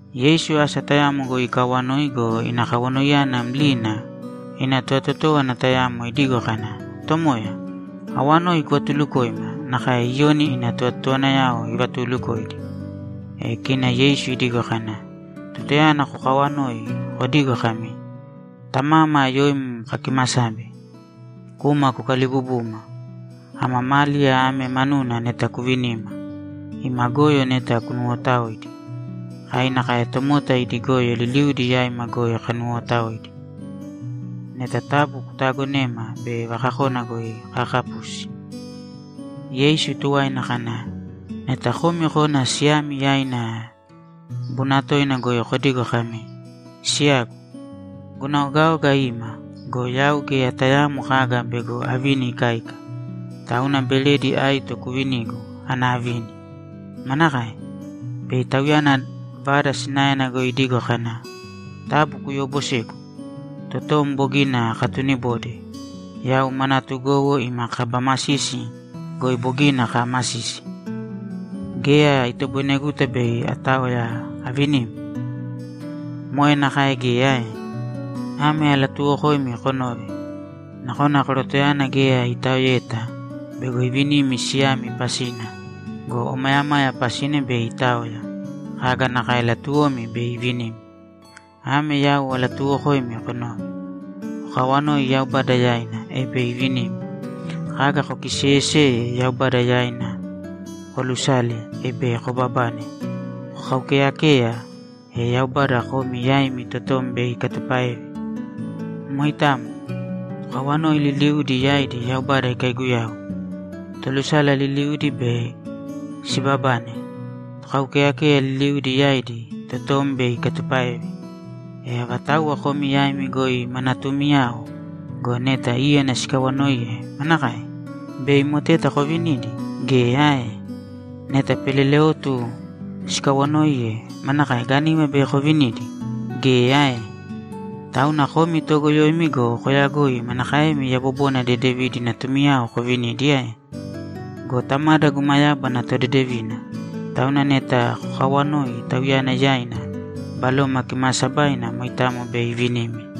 Yeisu asa tayamo goi ikaawanoi go, ina kawanoiyana mlina, ina tovatotówana tayamo idigo kana, ‘Tomoya, awanoi kuvatulukōima nakae Iyoni ina tovatotowanayao ivatuulukoidi.’ E kina Yeisu idigo kana, ‘Tutayana kokawanoi, kodīgo kami, “Tamama, yoim kakimasabe. Kūma kukalibubūma. Ama máliya ame manuna neta kuvinīma. Ima goyo neta kunuwotaōidi. Kai nakae tomota idi goyo liliudi yaima goi kanuwootaoidi. Neta taabu kutaagonēma bei vakakona goi kaakapusi.”’ Yeisu tuwaina kana, ‘Neta komi kona siyami yaina bunatoina goi kodigo kami, “Siyagu, guna ogaoga ima go, yau geya tayaamo kaga bego avini ikáika. Tauna beredi aito kuvinīgu ana avini.” Manakae? Bei tauyana vada sinaena goi idigo kana, “Taabu kuyoobosēgu. Totom bogina akatunibode. Yau ma natugowo ima kaba masisi goi bogina kaamasisi. Geya itoboineguta bei ataoya avinim”? Moe nakae geya ae? Ame alatuuwokoimi konōve: Nakona korotoyana geya itaoeta bego ivinimi siyami pasina go, omayamaya pasina bei itaoya, kaga nakae latuwomi bei ivinimi. Ame yau alatuuwokoimi konōve: Kokawanōi Yaubada yaina, e bei ivinimi. Kaga kokiseeyeseye Yaubada yaina koolusāle, e bei kobabane. Kokaukeeyakēya, e Yaubada komi yaimi totom bei ikatupáeve. Moitamo. Tokawanoi liliudi yaidi Yaubada ikaiguyau. Tolusala liliudi bei sibabane. Tokaukeyakeya liliudi yaidi, totom bei ikatupáeve. E avatauwa komi yaimi goi ma natuumiyao go, neta íyana sikawanoiye, manakae? Bei moteta kovinidi? Geya ae? Neta peleleotu sikawanoiye, manakae? Gániva bei kovinidi? Geya ae? Tauna komi toogoyoimi go, koyagoi manakaemi yabobona dedevidi natumiyao kovinidi ae? Go Tamada guma yábana todedevina, tauna neta kokawanoi Tauyana yaina, Baloma Kimaasabaina moitamo bei ivinimi.’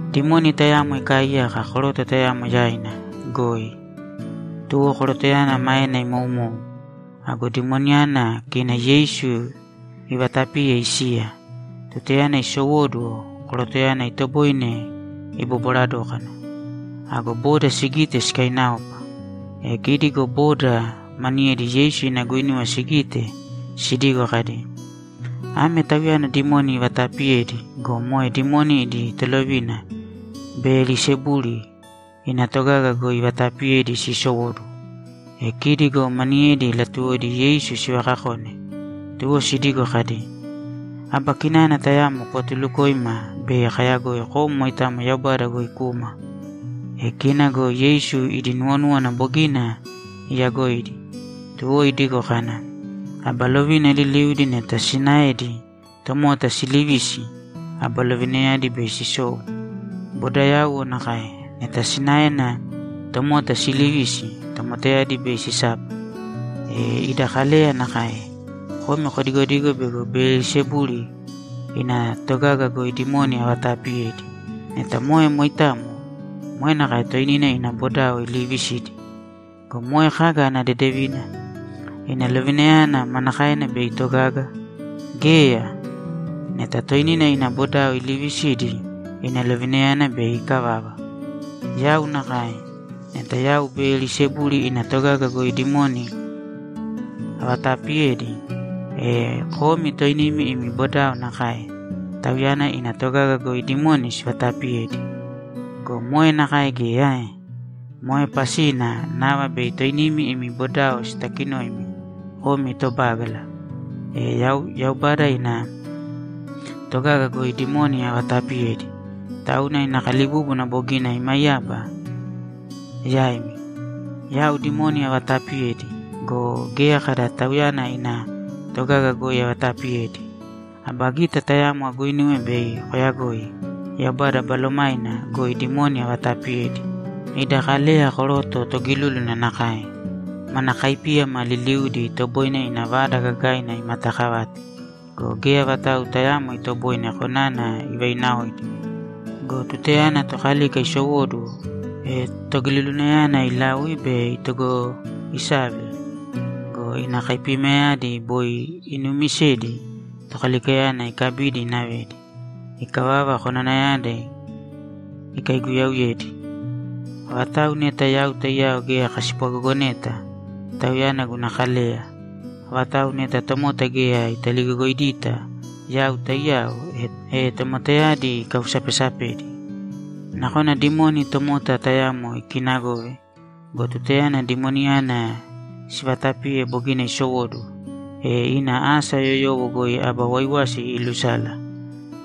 Dimoni tayamo ikaaiyaka koroto tayamo yaina goi, tuwo korotoyana maena imou. Ago dimoniyana, kina Yeisu ivaatapiye isiya. E tutayana isowóduwo, korotoyana itoboine ibobwara dókana. Ago boda sigite, sikainaopa. E kidi go boda maniyedi Yeisu ina guinuwa sigite sidigo kadi, ‘Ame Tauyana dimoni ivataapiyedi go, moe dimoni idi tolovina Beyelisebuli ina togaga goi ivataapiyedi siisowóduwo.’ E kidi go maniyedi latuwodi Yeisu sivakakone, tuwo sidigo kadi, ‘Aba kinana tayamo kuvatulukōima bei kayagoi kom moitamo Yaubada goi kuma.’ E kina go Yeisu idi nuwonúwana bogina iyagoidi, tuwo idigo kana, ‘Aba lovina liliudi neta sinaedi tomota siilivisi, aba lovinayadi bei sisou. Bodayauwo nakae. Neta sinaena tomota siilivisi, tomotayadi bei sisapa. E ida Kaleya nakae. Komi kodigodigo bego Beyelisebuli ina togaga goi dimoni avataapiyedi. Neta moe moitamo, moe nakae toinina ina bodao iliivisidi. Go moe kaga ana dedevina? Ina lovinayana manakaena bei itogaga? Geya! Neta toinina ina bodao iliivisidi, ina lovinayana bei ikavava! Yau nakae. Neta yau Beyelisebuli ina togaga goi dimoni avataapiyedi, e komi toinimi imi bodao nakae; tauyana ina togaga goi dimoni sivataapiyedi. Go moe nakae geya ae? Moe pasina nava bei toinimi imi bodao sitakinoimi komi tobágala. E yau Yaubada ina togaga goi dimoni avataapiyedi, tauna ina kalibúbuna bogina imaiyaba yaimi. Yau dimoni avataapiyedi go, geya kada tauyana ina togaga goi avataapiyedi. Aba gita tayamo aguinuwe bei koyagoi Yaubada Balomaina goi dimoni avataapiyedi. Ida Kaleya koroto togilúluna nakae. Mana kaipíyama liliudi, itoboine ina vada gagaina imatakavate go, geya vatau tayaamo itoboine konana ivainaoidi. Go tutayana tokalika isowóduwo, e togilulunayana ilaui be itogoisave go, ina kaipiyamayadi boi inuumisedi tokalikayana ikabidi inavedi. Ikavava, konanayadi ikaiguyauyedi. Avatau neta yau taiyao geya kaspwagogoneta, tauyana guna kaleya. Avatau neta tomota geya italigogoidita yau taiyao, e tomotayadi ikausapesapedi. Nakona dimoni tomota tayamo ikinagove go, tutayana dimoniyana sivatapiye bogina isowóduwo, e ina asa yoyowo goi aba waiwasi iilusala.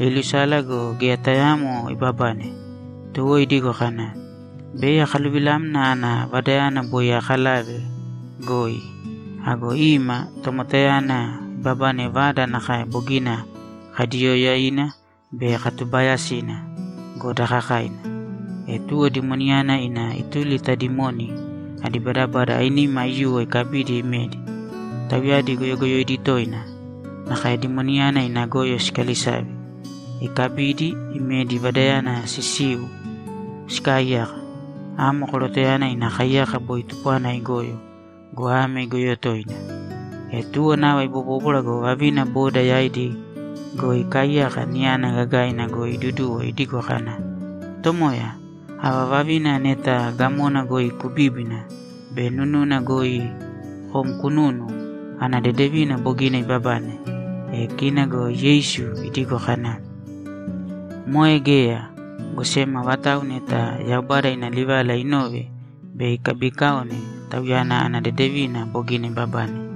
Iilusala go, geya tayaamo ibabane. Tuwo idigo kana, “Bei akaluvilamna ana vadayana boi aakalave goi.” Ago ima, tomotayana ibabane vada nakae bogina kaidiiyoyaina be katubaayasina go, daakakaina. E tuwo dimoniyana ina ituli ta dimoni adi badabada ainima aiyuwo ikabidi imedi. Tauyadi goyogoyoidi toina, nakae dimoniyana ina goyo sikalisave. Ikabidi, imedi vadayana sisiu sikaaiyaka. Amo korotoyana ina kaiyaka boi tupwana igoyo go, ame igoyo toina.’ E tuwo nava ibobóbwara go, vavina boda yaidi goi ikaaiyaka niyana gagaina goi iduduwo idigo kana, ‘Tomoya, ava vavina neta gamona goi kubíbina be nununa goi kom kununu, ana dedevina bogina ibabane!’ E kina go Yeisu idigo kana, ‘Moe geya, go sem avatau neta Yaubada ina livala inove be ikabikaone, tauyana ana dedevina bogina ibabane.’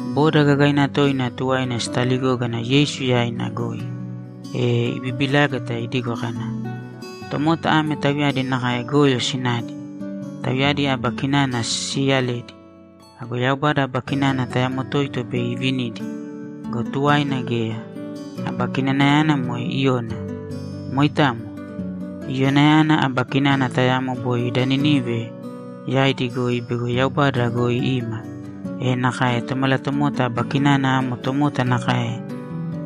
Boda gagaina toina tuwaina sitaligógana Yeisu yaina goi, e ibibilágata idigo kana, ‘Tomota ame tauyadi nakae goyo sinadi; tauyadi aba kinana siiyaledi. Ago Yaubada aba kinana tayamo toito bei ivinidi go, tuwaina geya. Aba kinanayana moe Iyona. Moitamo. Iyonayana aba kinana tayamo boi da Ninivei yaidi goi bego Yaubada goi ima, e nakae Tomalatomota aba kinana amo tomota nakae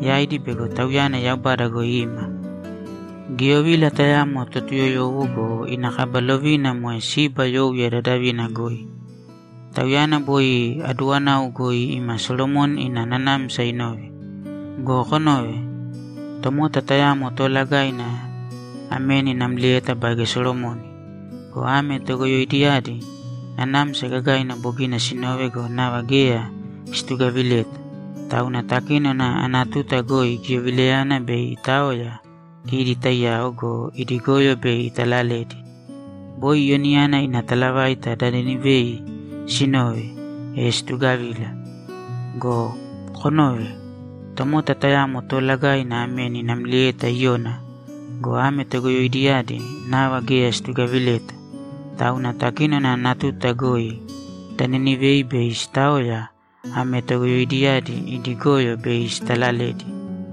yaidi bego Tauyana Yaubada goi ima. Giyovila tayamo Totuyoyowo go, ina kaba lovina moe Siba youya dadavina goi. Tauyana boi aduwanau goi ima Solomoni ina nanamsa inove. Go konōve. Tomota tayamo toolagaina ameni namlieta baige Solomoni. Go ame togoyoidiyadi nanamsa gagaina bogina sinove go, nava geya situgavileta. Tauna takínona ana tuta goi giyovilayana bei itaoya kidi taiyao go, idi goyo bei italaledi. Boi Iyonayana ina talavaita da Ninivei sinove, e situgavila. Go konōve. Tomota tayamo toolagaina ameni namlieta Iyona go, ame togoyoidiyadi nava geya situgavileta. Tauna takínona ana tuta goi da Ninivei bei sitaoya, ame togoyoidiyadi idi goyo bei sitalaledi.’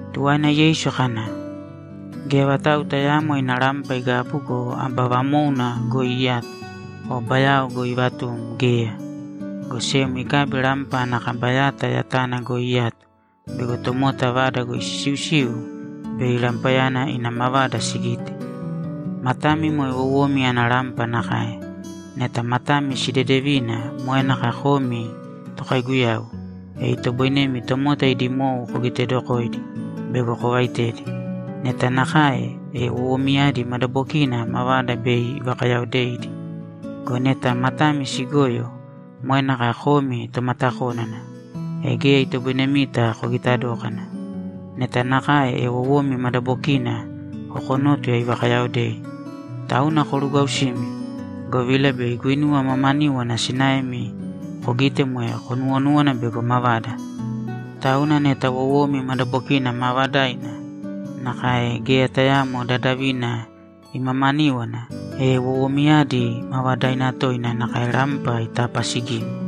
Tuwaina Yeisu kana, ‘Geya vatau tayaamo ina rampa igabu go, aba vamóuna goi iyato o bayao goi ivatum geya, go sem ikabi rampa ana kaba yata yatana goi iyato bego tomota vada goi sisiusiu bei rampayana ina mavada sigite. Matami moe wowomi ana rampa nakae. Neta matami sidedevina moe nakae komi tokaiguyau, e itoboinemi tomota idi mou kogitedokoidi bego kovaitedi. Neta nakae, e wowomiyadi madabokina mavada bei ivakayaodeidi. Go neta matami sigoyo, moe nakae komi tomatakónana, e geya itoboinemita kogita dókana. Neta nakae, e wowomi madabokina kokonótuya ivakayaodei. Tauna korugwausīmi, govila bei guinuwa mamaníwana sinaemi kogite moe konuwonúwana bego mavada. Tauna neta wowomi madabokina maavadaina, nakae geya tayaamo dadavina imamaníwana, e wowomiyadi maavadaina toina nakae rampa itapaasigimi.’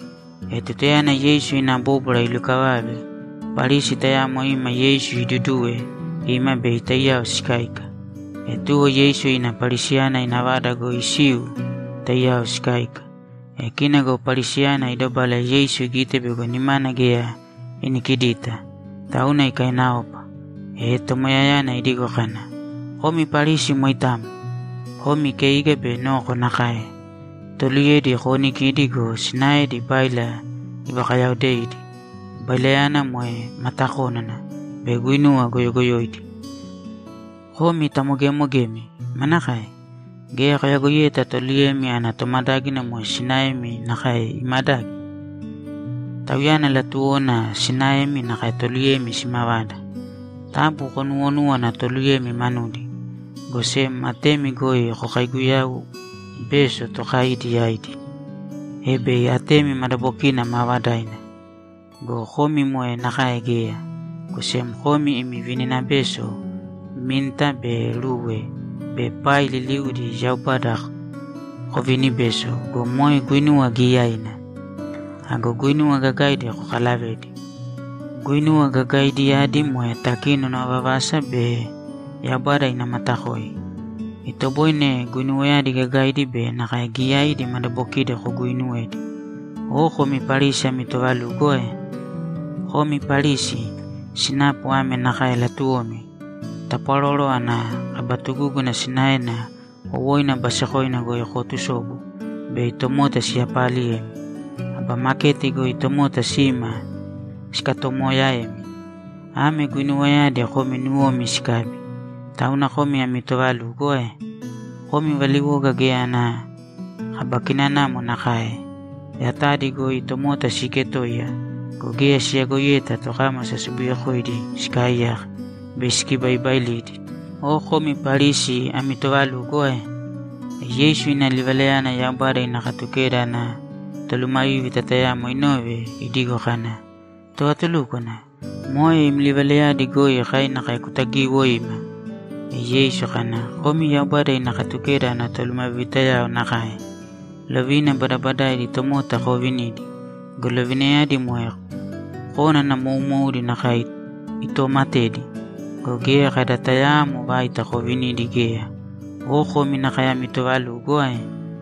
E tutayana Yeisu ina bóbwara ilukavave, Parisi tayamo ima Yeisu iduduwe ima bei taiyao sikáika. E tuwo Yeisu ina Parisiyana ina vada goi isiu taiyao sikáika. E kina go Parisiyana idobala Yeisu igite bego nimana geya inikidita, tauna ikainaopa. E Tomoyayana idigo kana, ‘Komi Parisi moitamo! Komi keiga be noko nakae. Toluyedi koonikidi go, sinaedi báila ivakayaodeidi, bailayana moe matakónana be guinuwa goyogoyoidi. Komi tamogemogemi! Manakae? Geya koyagoiyeta toluyemi ana tomadágina moe sinaemi nakae imadagi? Tauyana latuwona sinaemi nakae toluyemi simavada. Taabu konuuwonūwana toluyemi manudi, go sem atemi goi kokaiguyau bēso tokai yaidi, e bei atemi madabokina maavadaina. Go komi moe nakae geya, go sem komi imi vininabeso minta be rue be pai liliudi Yaubada kovinibeso go, moe guinuwa giyaiina. Ago guinuwa gagaidi kokalavedi. Guinuwa gagaidiyadi moe takinona vavasa be Yaubada ana matakoi. Itoboine guinuwayadi gagaidi be nakae giyaidi madabokidi koguuinuwedi. Oo komi Parisi ami toovalugo ae? Komi Parisi, sinapu ame nakae latuwomi: Tapwaroro ana kaba tugúguna sinaena wowoina basekoina goi kootusobu bei tomota siyapaaliyemi. Aba maketi goi tomota sima sikatoomoyaemi. Ame guinuwayadi komi nuwomi sikabi. Tauna komi ami toovalugo ae? Komi valiwoga geya ana kaba kinanamo nakae. Yatadi goi tomota siiketoiya go, geya siyagoiyeta tokámasa sobuyekoidi sikaaiyaka be sikibaibailidi. Oo komi Parisi ami toovalugo ae?’ E Yeisu ina livalayana Yaubada ina Katukeda ana tolumavívita tayamo inove idigo kana, ‘Tovatulúkwana, moe im livalayadi goi kai nakae kutagiwoima.’ E Yeisu kana, ‘Komi Yaubada ina Katukeda ana tolumavivitayao nakae. Lovina badabadaidi tomota koovinidi go, lovinayadi moe kónana moumoudi nakae itoomatedi go, geya kada tayaamo vaita kovinidi geya. Oo komi nakae ami toovalugo ae?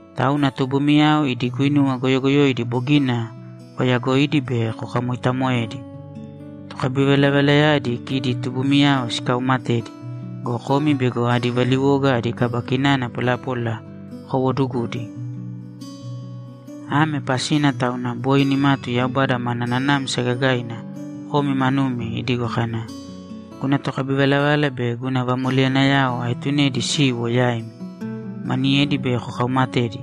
Tauna tubumiyao idi guinuwa goyogoyoidi bogina koyagoidi be kokamoitamoedi. Tokabivalavalayadi kidi tubumiyao sikaumatedi go, komi bego adi valiwoga adi kaba kinana polapola kowoodugudi. Ame pasina tauna boi nimatu Yaubada mana nanamsa gagaina komi manumi idigo kana, “Guna tokabivalavala be guna vamoleyanayao aetunedi siwo yaimi. Maniyedi bei kokaumatedi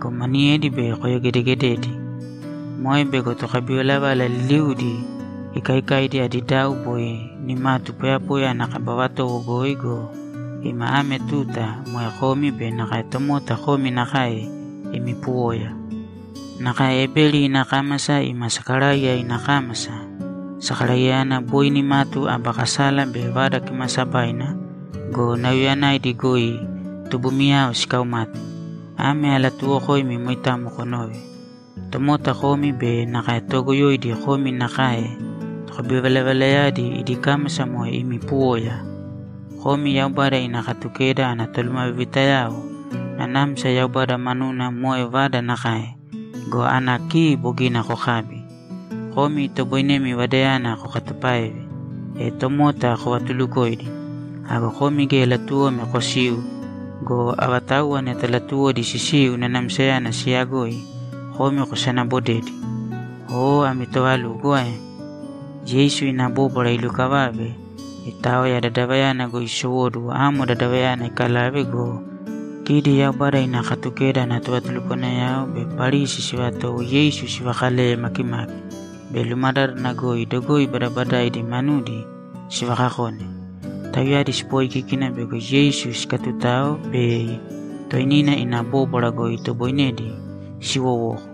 go, maniyedi bei koyogedegededi.” Moe bego tokabivalavala liliudi ikaikaidi adi dau boi nimatu poyapoya ana kaba vatowo goi go, ima ame tuta moe komi be nakae tomota komi nakae imi puwoya. Nakae Ebeli ina kámasa ima Sakaraiya ina kámasa, Sakaraiyayana boi nimatu aba kasala be Vada Kimaasabaina go, nauyayanaidi goi tubumiyao sikaumate. Ame alatuuwokoimi moitamo konōve: Tomota komi be nakae toogoyoidi komi nakae tokabivalavalayadi idi kámasa moe imi puwoya! Komi Yaubada ina Katukeda ana tolumavivitayao, nanamsa Yaubada manuna moe vada nakae go, ana ki bogina kokabi. Komi itoboinemi vadayana kokatupáeve, e tomota kovatulukoidi. Ago komi geya latuwomi kosiu go, avatauwa neta latuwodi sisiu nanamsayana siyagoi, komi kosanabodedi. Oo ami toovalugo ae?’ Yeisu ina bóbwara ilukavave, itaoya vadayana goi isowóduwo amo dadavayana ikalave go, kidi Yaubada ina Katukeda ana tovatulukwanayao be Parisi sivatowo Yeisu sivakaleye makimaki be lumadádana goi dogoi badabadaidi manudi sivakakone. Tauyadi sipoikíkina bego Yeisu sikatutao bei toinina ina bóbwara goi itoboinedi siwowoko.